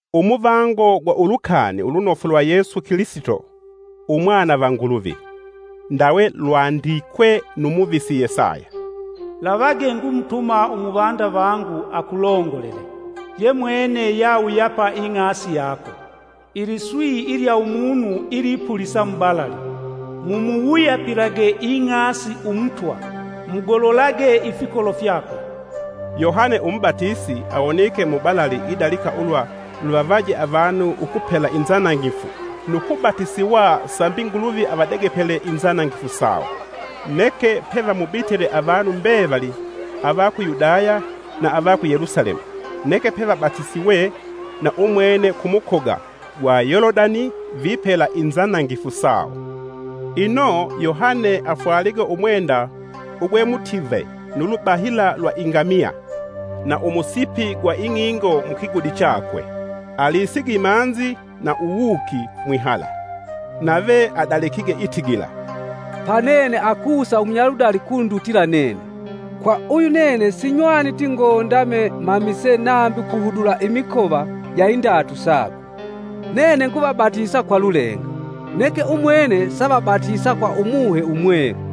Umuvango gwa Ulukani Ulunofu lwa Yesu Kilisito Umwana va Nguluvi. Ndawe lwandikwe nu muvisi Yesaya: “Lavage ngumutuma umuvanda vangu akulongolele; yemwene yawuyapa ing'asi yako. Iliswi ilya Umunu ilipulisa mubalali: ‘Mumuwuyapilage ing'asi Umutwa, mugololage ifikolo fyakwe.’” Yohane umubatisi awonike mubalali idalika ulwa luvavaje avanu ukupela inzanangifu nu kubatisiwa sambi Nguluvi avadegepele inzanangifu sawo. Neke pevamubitile avanu mbevali ava ku Yudaya na ava ku Yelusalemu, neke pevabatisiwe na umwene ku mukoga gwa Yolodani vipela inzanangifu sawo. Ino Yohane afwalige umwenda ugwe mutive nu lubahila lwa ingamiya na umusipi gwa ing'ingo mukigudi chakwe. Alisige imanzi na uwuuki mwihala. Nave adalikige itigila, “Pa nene akusa umunyaludali ukundutila nene; kwa uyu nene sinywaniti ngondame mamise nambi kuhudula imikova ja indatu sakwe. Nene nguvabatisa kwa lulenga, neke umwene saavabatisa kwa Umuhe Umwelu.”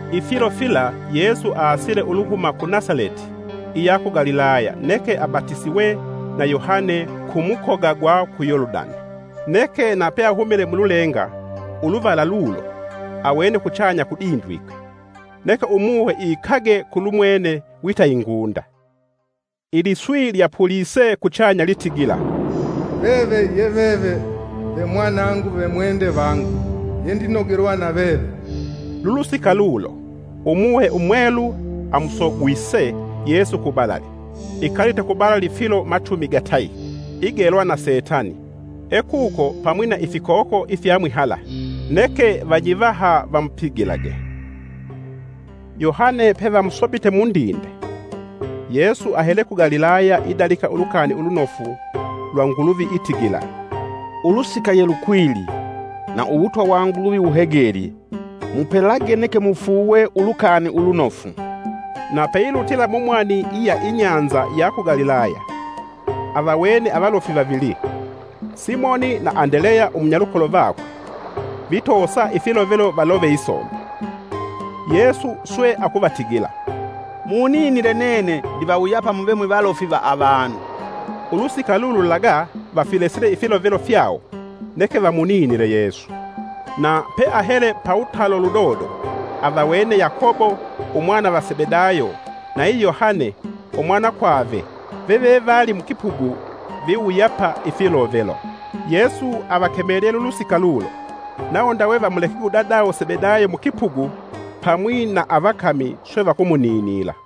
Ifilo fila Yesu aasile uluhuma ku Nasaleti iya ku Galilaya neke abatisiwe na Yohane ku mukoga gwa ku Yolodani. Neke na peahumile mululenga uluvala lulo awene kuchanya kudindwike neke Umuhe iikage kulumwene wita ingunda. Iliswi lyapulise kuchanya litigila, “Veve ye veve ve mwanangu vemwende vangu yendinogelwa na veve.” Lulusika lulo Umuhe Umwelu amusogwise Yesu kubalali, ikalite kubalali filo machumi gatayi, igelwa na setani. Ekuko pamwi na ifikoko ifya mwihala, neke vanyivaha vamupigilage. Yohane pevamusopite mundinde, Yesu ahele ku Galilaya idalika Ulukani Ulunofu lwa Nguluvi, Itigila, “Ulusika yelukwilye, na Uwutwa wa Nguluvi wuhegelye. Mupelage neke mufuuwe Ulukani Ulunofu!” Na peilutila mumwani iya inyanza ya ku Galilaya, avawene avalofi vavili; Simoni na Andeleya umunyalukolo vakwe vitoosa ifilovelo valove isomba. Yesu swe akuvatigila, “Muninile nene ndivawuyapa muve mwivalofi va avanu.” Ulusika lululaga vafilesile ifilovelo fyawo neke vamuninile Yesu. Na peahele pawutalo ludodo, avawene Yakobo Umwana va Sebedayo nayi Yohane umwanakwave vevevali mukipugu viwuyapa ifilovelo. Yesu avakemelye lulusika lulo, nawo ndawe vamulekige udadawo Sebedayo mukipugu pamwi na avakami, swe vakumuninila.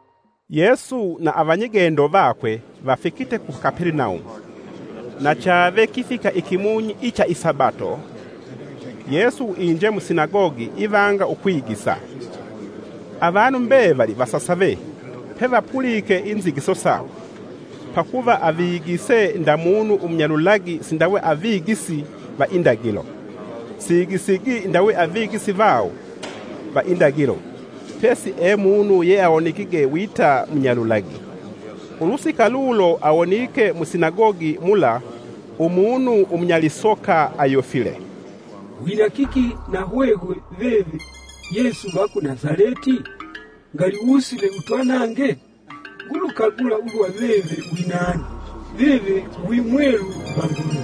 Yesu na avanyigendo vakwe vafikite ku Kapelenaumu, na chave kifika ikimunyi icha isabato, Yesu inje musinagogi ivanga ukwigisa. Avanu mbevali vasasave pevapulike inzigiso sakwe, pakuva avigisi nda munu umunyalulagi sindawe avigisi va indagilo. siigisigi ndawe avagisi vawo va indagilo, pesi e munu yeawonekige wita munyalulagi. Ulusika lulo awonike musinagogi mula umunu umunyalisoka, ayofile, “Wina kiki nahwehwe, veve Yesu va ku Nasaleti? Ngali wusile utwanange? Ngulukagula ulwa veve winani; veve wi Mwelu va Nguluvi!”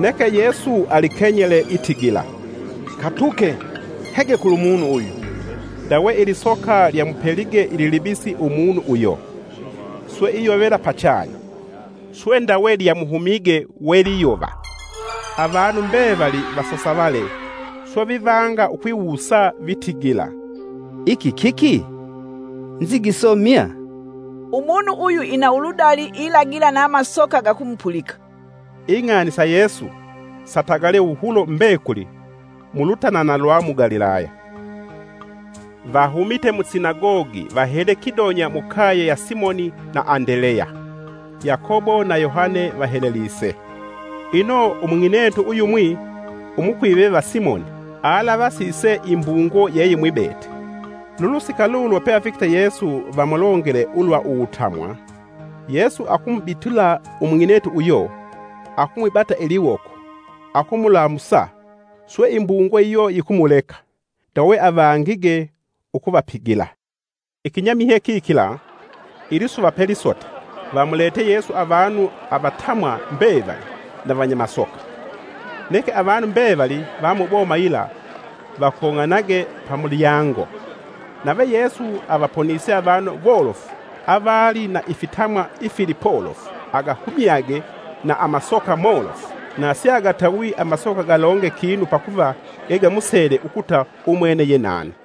Neke Yesu alikenyele itigila, “Katuke! Hege kulumunu uyu.” Ndawe ilisoka lyamupelige ililibisi umunu uyo, swe iyovela pachanya, swe ndawe lyamuhumige. Avanu mbevali vasasavale swe vivanga ukwiwusa vitigila, “Iki kiki? Nzigiso mya? Umunu uyu ina uludali ilagila na masoka gakumupulika!” Ing'ani sa Yesu satagalye wuhulo mbekuli mulutanana lwa mu Galilaya. Vahumite musinagogi vahele kidonya mukaye ya Simoni na Andeleya; Yakobo na Yohane vahelelise. Ino umung'inetu uyumwi umukwive va Simoni alavasise imbungo yeyimwibete. Lulusika lulo peafikite Yesu vamulongele ulwa uwutamwa. Yesu akumubitila umung'inetu uyo, akumwibata iliwoko akumulamusa. Swe imbungo iyo yikumuleka, ndawe avangige ukuvapigila. Ikinyamihye kikila, ilisuva pelisota, vamuletye Yesu avanu avatamwa mbevali na vanyamasoka. Neke avanu mbevali va muboma yila vakong'anage pamulyango. Nave Yesu avaponise avanu wolofu avali na ifitamwa ifili polofu; agahumyage na amasoka molofu; na siagatawi amasoka galonge kinu pakuva gegamusele ukuta umwene ye nani.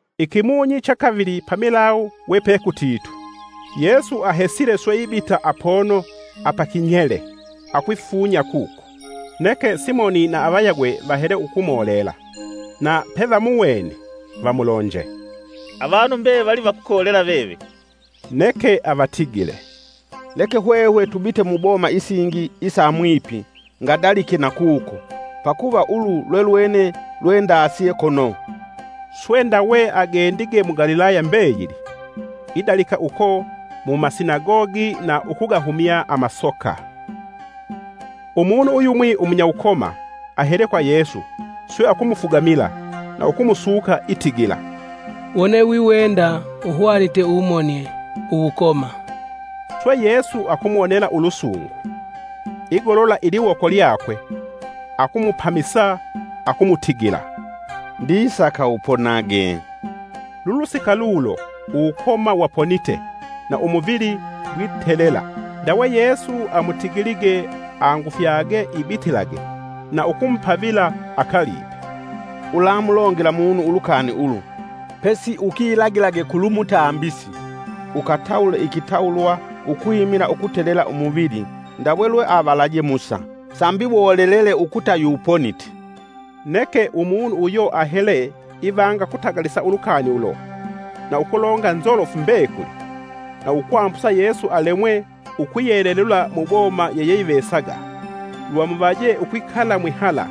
Ikimunyi cha kavili pamilawu we pekutitu, Yesu ahesile swe ibita apono apakinyele akwifunya kuko. Neke Simoni na avayagwe vahele ukumulela. Na pevamuwene, vamulonje, “Avanu mbevali vakukolela veve.” Neke avatigile, “Leke hwehwe tubite mu boma isingi isa mwipi ngadalike nakuko; pakuva ulu lwelwene lwendasye kono.” Swe ndawe agendige mu Galilaya mbeyili idalika uko mu masinagogi na ukugahumya amasoka. Umunu uyumwi umunyawukoma ahele kwa Yesu swe akumufugamila na ukumusuka itigila, “Wone wiwenda uhwanite umonie uwukoma!” Swe Yesu akumuwonela ulusungu, igolola iliwoko lyakwe akumupamisa akumutigila, “Ndisaka uponage!” Lulusika lulo uwukoma waponite na umuvili gwitelela. Ndawe Yesu amutigilige angufyage ibitilage na ukumupavila akalipe, “Ulamulongela munu ulukani ulu, pesi ukilagilage kulumutambisi; ukatawule ikitawulwa ukwimila ukutelela umuvili ndawe lwe avalaje Musa, sambi wolele ukuta yuponite.” Neke umunu uyo ahele, ivanga ukutagalisa ulukani ulo, na ukulonga nzolofu mbekuli, na ukwambusa Yesu alemwe ukwiyelelula mu boma yeyeyivesaga; lwamuvaje ukwikala mwihala,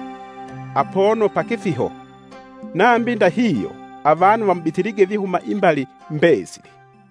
apono pakifiho. Nambi ndahihyo avanu vamubitilige vihuma imbali mbesili.